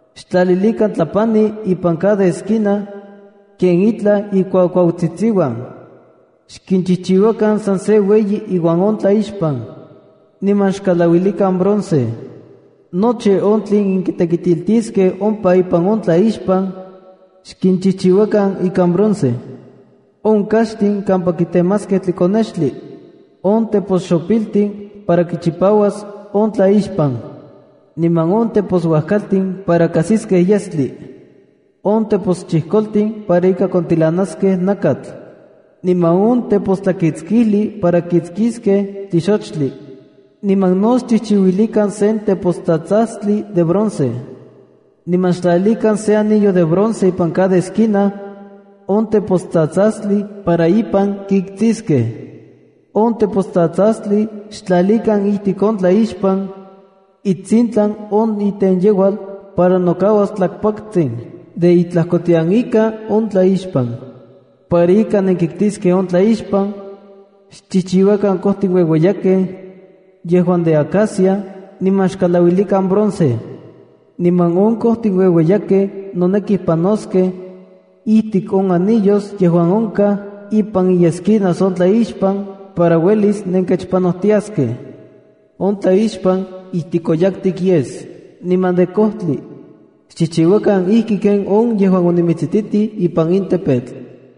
Xtlalilikan tlapani ipan cada esquina ken itlaj ikuakuautsitsiuan. Xkinchijchiuakan san se ueyi iuan on tlaixpan, niman xkalauilikan bronce. Nochi on tlen kitekitiltiskej ompa ipan on tlaixpan xkinchijchiuakan ikan bronce: on kaxtin kampa kitemaskej tlikonextli, on teposxopiltin para kichipauas on tlaixpan, niman on teposuajkaltin para kajsiskej yestli, on teposchijkoltin para ika kontilanaskej nakatl, niman on tepostlakitskijli para kiktsiskej tlixochtli. Niman no xchijchiuilikan sen tepostsatsastli de bronce. Niman xtlalilikan se anillo de bronce ipan cada esquina on tepostsatsastli para ipan kiktsiskej. On tepostsatsastli xtlalikan ijtik on tlaixpan itsintlan on itenyeual para nokauas tlakpaktsin de itlajkotian ika on tlaixpan. Para ika nenkiktiskej on tlaixpan, xchijchiuakan kojtin ueueyakej yejuan de acacia niman xkalauilikan bronce. Niman on kojtin ueueyakej noneki panoskej ijtik on anillos yejuan onkaj ipan iesquinas on tlaixpan para uelis nenkechpanojtiaskej. On tlaixpan ijtikoyaktik yes niman de kojtli. Xchijchiuakan ijki ken on yejuan onimitsijtitij ipan in tepetl.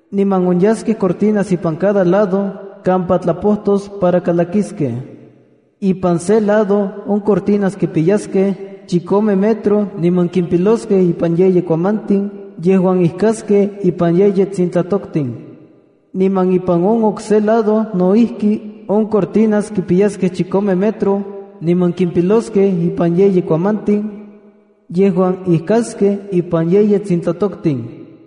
Niman onyaskej cortinas ipan cada lado kampa tlapojtos para kalakiskej. Ipan se lado on cortinas kipiyaskej chikome metro niman kimpiloskej ipan yeyi kuamantin yejuan ijkaskej ipan yeyi tsintlatoktin. Niman ipan on okse lado no ijki on cortinas kipiyaskej chikome metro, niman kimpiloskej ipan yeyi kuamantin yejuan ijkaskej ipan yeyi tsintlatoktin.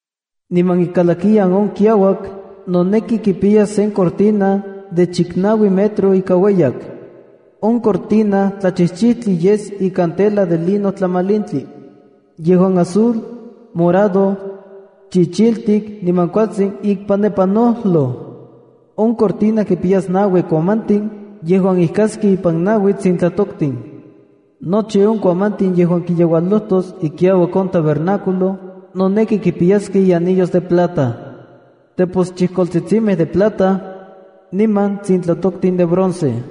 ’Niman ikalakiyan on kiauak noneki kipiyas sen cortina de chiknaui metro ika ueyak. On cortina tlachijchijtli yes ikan tela de lino tlamalintli yejuan azul, morado, chichiltik niman kualtsin ikpanepanojloj. On cortina kipiyas naui kuamantin yejuan ijkaskej ipan naui tsintlatoktin. Nochi on kuamantin yejuan kiyeualojtos ikiauak on tabernáculo noneki kimpiyaskej ianillos de plata, teposchijkoltsitsimej de plata, niman tsintlatoktin de bronce.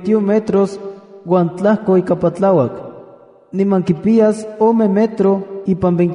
metros uan tlajko ika patlauak. Niman kipiyas ome metro ipan